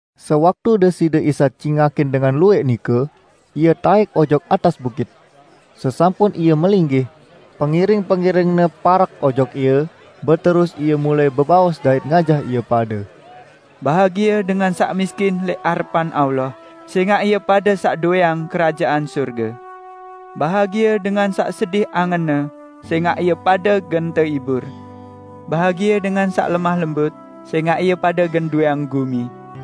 Sewaktu Deside Isa cingakin dengan luwẽq nike, Ie taẽk ojok atas bukit. Sesampun Ie melinggih, pengiring-pengiring-Ne parek ojok Ie, beterus Ie mulai bebaos dait ngajah ie pade: "Bahagie dengan saq miskin lẽq arepan Allah; sẽngaq ie pade saq dowẽang Kerajaan Sorge! Bahagie dengan saq sedih angenne; sẽngaq ie pade gen tehibur. Bahagie dengan saq lemah lembut; sẽngaq ie pade gen dowẽang gumi!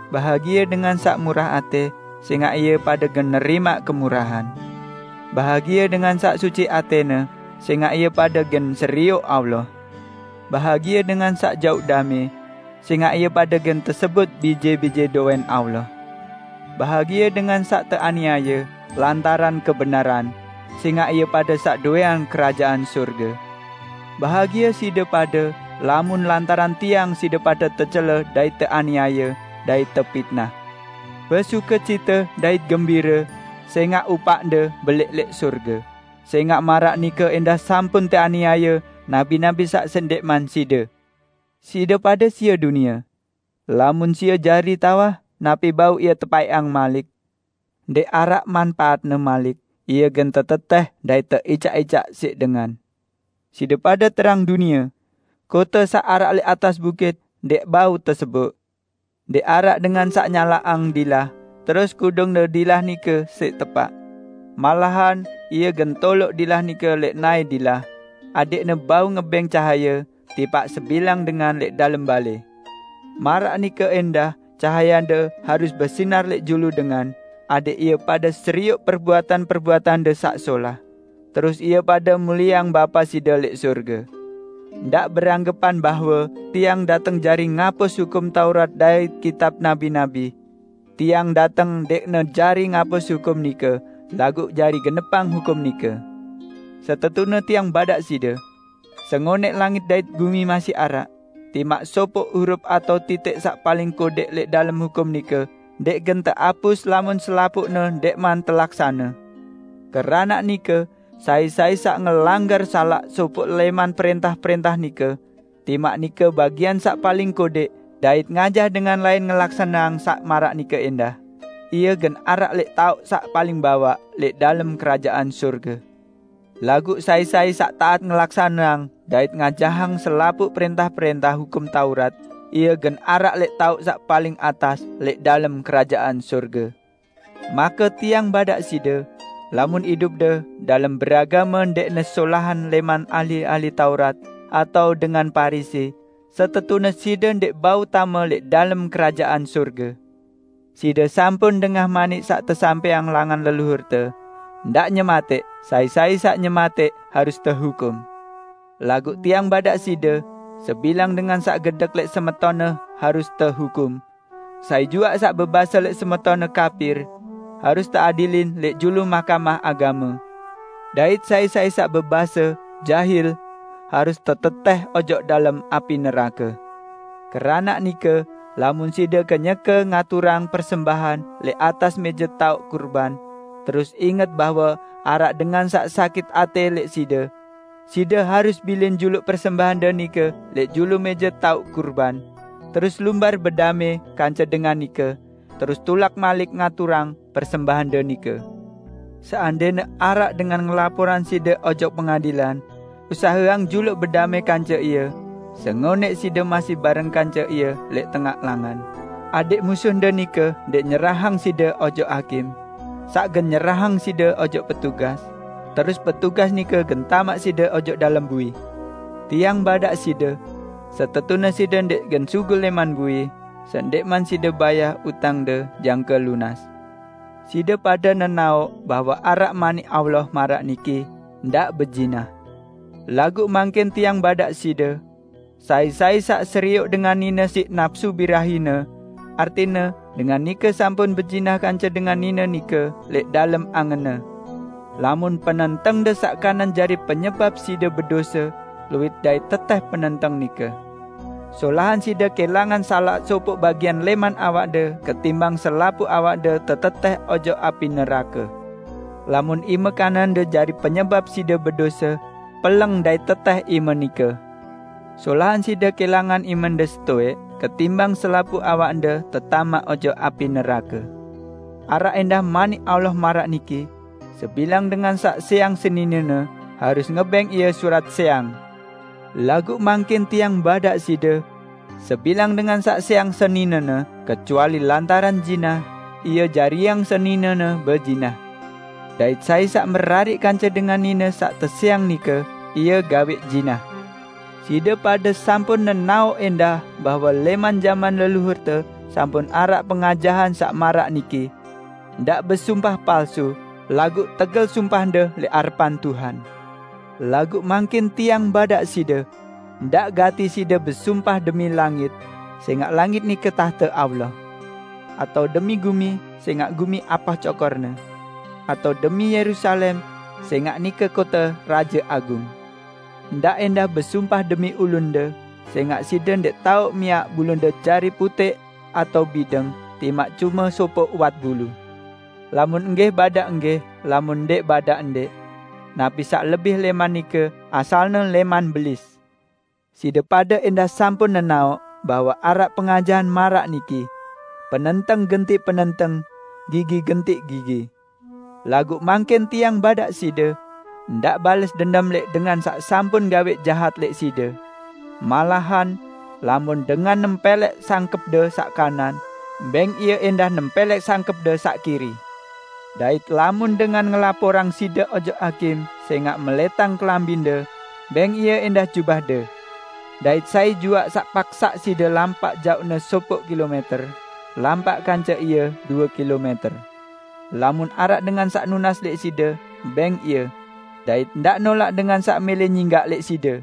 Bahagie dengan saq murah atẽ; sẽngaq ie pade gen nerimaq kemurahan! Bahagie dengan saq suci atẽne; sẽngaq ie pade gen serioq Allah. Bahagie dengan saq jauq damẽ; sẽngaq ie pade gen tesebut bije-bije dowẽn Allah! Bahagie dengan saq teaniaye lantaran kebenaran, sẽngaq ie pade saq dowẽang Kerajaan Sorge! Bahagie side pade, lamun lantaran Tiang side pade tecele dait teaniaye, dait tepitnah. Besukecite dait gembire, sẽngaq upaqde belẽq lẽq sorge, sẽngaq maraq nike ẽndah sampun teaniaye nabi-nabi saq sendẽqman side." "Side pade sie dunie. Lamun sie jari tawah, napi bau ie tepaẽqang malik? Ndẽq araq manpaatne malik, ie gen tetetẽh dait teicaq-icaq siq dengan. Side pade terang dunie. Kote saq araq lẽq atas bukit, ndẽq bau teseboq. Ndẽq araq dengan saq nyalaqang dilah, terus kudungne dilah nike siq tepaq. Malahan ie gen toloq dilah nike lẽq naẽ dilah, adẽqne bau ngebẽng cahaye tipaq sebilang dengan lẽq dalem balẽ. Maraq nike ẽndah cahayende harus besinar lẽq julu dengan, adẽq ie pade serioq perbuatan-perbuatande saq solah, terus ie pade mulieang Bapa side lẽq sorge." "Ndaq beranggepan bahwe Tiang dateng jari ngapus Hukum Taurat dait kitab nabi-nabi. Tiang dateng ndẽqne jari ngapus hukum nike, laguq jari genepang hukum nike. Setetune Tiang badaq side! Sengonẽq langit dait gumi masih araq, timaq sopoq hurup atao titik saq paling kodẽq lẽq dalem hukum nike ndẽq gen teapus lamun selapuqne ndẽqman telaksane! Keranaq nike, sai-sai saq ngelanggar salaq sopoq lẽman prẽntah-prẽntah nike, timaq nike bagian saq paling kodẽq, dait ngajah dengan lain ngelaksaneang saq maraq nike ẽndah, ie gen araq lẽq taoq saq paling bawaq lẽq dalem Kerajaan Sorge. Laguq sai-sai saq taat ngelaksaneang dait ngajahang selapuq prẽntah-prẽntah Hukum Taurat, ie gen araq lẽq taoq saq paling atas lẽq dalem Kerajaan Sorge. Make Tiang badaq side: Lamun idupde dalem beragame ndẽqne solahan lẽman ahli-ahli Taurat atao dengan Parisi, setetune side ndẽq bau tame lẽq dalem Kerajaan Sorge!" "Side sampun dengah manik saq tesampẽang langan leluhurte: Ndaq nyematẽq; sai-sai saq nyematẽq harus tehukum. Laguq Tiang badaq side, sebilang dengan saq gedek lẽq semetonne harus tehukum; sai juaq saq bebase lẽq semetonne: Kapir! Harus teadilin lẽq julu Mahkamah Agame. Dait sai-sai saq bebase "Jahil", harus tetetẽh ojok dalem api nerake. Keranaq nike, lamun side kenyeke ngaturang persembahan lẽq atas mẽje taoq kurban, terus inget bahwe araq dengan saq sakit atẽ lẽq side, side harus bilin juluq persembahande nike lẽq julu mẽje taoq kurban, terus lumbar bedamẽ kance dengan nike, terus tulak malik ngaturang persembahande nike. Seandẽne araq dengan ngelaporang side ojok pengadilan, usaheang juluq bedamẽ kance ie sengonẽq side masih bareng kance ie lẽq tengaq langan, adẽq musuhde nike ndẽq nyerahang side ojok hakim, saq gen nyerahang side ojok petugas, terus petugas nike gen tamaq side ojok dalem bui. Tiang badaq side: Setetune side ndẽq gen sugul lẽman bui sendẽqman side bayah utangde jangke lunas." "Side pade nenaoq bahwe araq Manik Allah maraq niki: Ndaq bezinah. Laguq mangkin Tiang badaq side: Sai-sai saq serioq dengan nine siq napsu birahine, artine dengan nike sampun bezinah kance dengan nine nike lẽq dalem angenne. Lamun penentengde saq kanan jari penyebap side bedose, luit dait tetẽh penenteng nike! Solahan side kẽlangan salaq sopoq bagian lẽman awakde ketimbang selapuq awakde tetetẽh ojok api nerake. Lamun ime kanande jari penyebap side bedose, peleng dait tetẽh ime nike! Solahan side kẽlangan imende setowẽq ketimbang selapuq awakde tetamaq ojok api nerake." "Araq ẽndah Manik Allah maraq niki: Sebilang dengan saq sẽang seninene harus ngebẽng ie surat sẽang. Laguq mangkin Tiang badaq side: Sebilang dengan saq sẽang seninene kecuali lantaran zinah, ie jariang seninene bezinah; dait sai saq merariq kance dengan nine saq tesẽang nike, ie gawẽq zinah." "Side pade sampun nenaoq ẽndah bahwe lẽman jaman leluhurte sampun araq pengajahan saq maraq niki: Ndaq besumpah palsu, laguq tegel sumpahde lẽq arepan Tuhan. Laguq mangkin Tiang badaq side: Ndaq gati side besumpah demi langit, sẽngaq langit nike tahte Allah, atao demi gumi, sẽngaq gumi apah cokor-Ne; atao demi Yerusalem, sẽngaq nike kote Raje Agung. Ndaq ẽndah besumpah demi ulunde, sẽngaq side ndẽq tao miaq bulunde jari putẽq atao bideng timaq cume sopoq uwat bulu. Lamun enggih, badaq enggih, lamun ndẽq badaq ndẽq. Napi saq lebih lẽman nike asalne lẽman Belis." "Side pade ẽndah sampun nenaoq bahwe araq pengajahan maraq niki: Penenteng gentiq penenteng, gigi gentiq gigi. Laguq mangkin Tiang badaq side: Ndaq bales dendem lẽq dengan saq sampun gawẽq jahat lẽq side. Malahan, lamun dengan nempẽlẽk sangkẽpde saq kanan, bẽng ie ẽndah nempẽlẽk sangkẽpde saq kiri. Dait lamun dengan ngelaporang side ojok hakim sẽngaq melẽtang kelambinde, bẽng ie ẽndah jubahde. Dait sai juaq saq paksaq side lampaq jaoqne sopoq kilomẽter, lampaq kance ie due kilomẽter. Lamun araq dengan saq nunas lẽq side, bẽng ie. Dait ndaq nolaq dengan saq mẽlẽ nyinggaq lẽq side."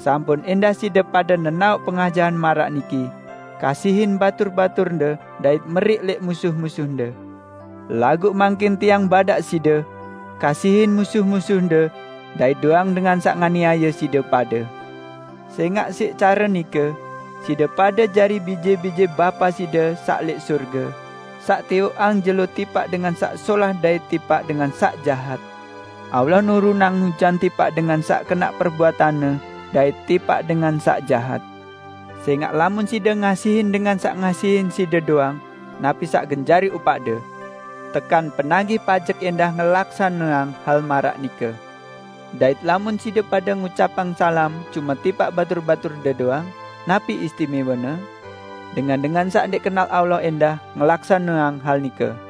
"Sampun ẽndah side pade nenaoq pengajahan maraq niki: Kasihin batur-baturde dait meriq lẽq musuh-musuhde. Laguq mangkin Tiang badaq side: Kasihin musuh-musuhde dait do'eang dengan saq nganiaye side pade, sẽngaq siq care nike side pade jari bije-bije Bapa side saq lẽq sorge, saq tiwoqang jelo tipaq dengan saq solah dait tipaq dengan saq jahat. Allah nurunang ujan tipaq dengan saq kenaq perbuatanne dait tipaq dengan saq jahat. Sẽngaq lamun side ngasihin dengan saq ngasihin side doang, napi saq gen jari upaqde? Tekan penagih pajek ẽndah ngelaksaneang hal maraq nike. Dait lamun side pade ngucapang salam cume tipaq batur-baturde doang, napi istimẽwene? Dengan-dengan saq ndẽq kenal Allah ẽndah ngelaksaneang hal nike!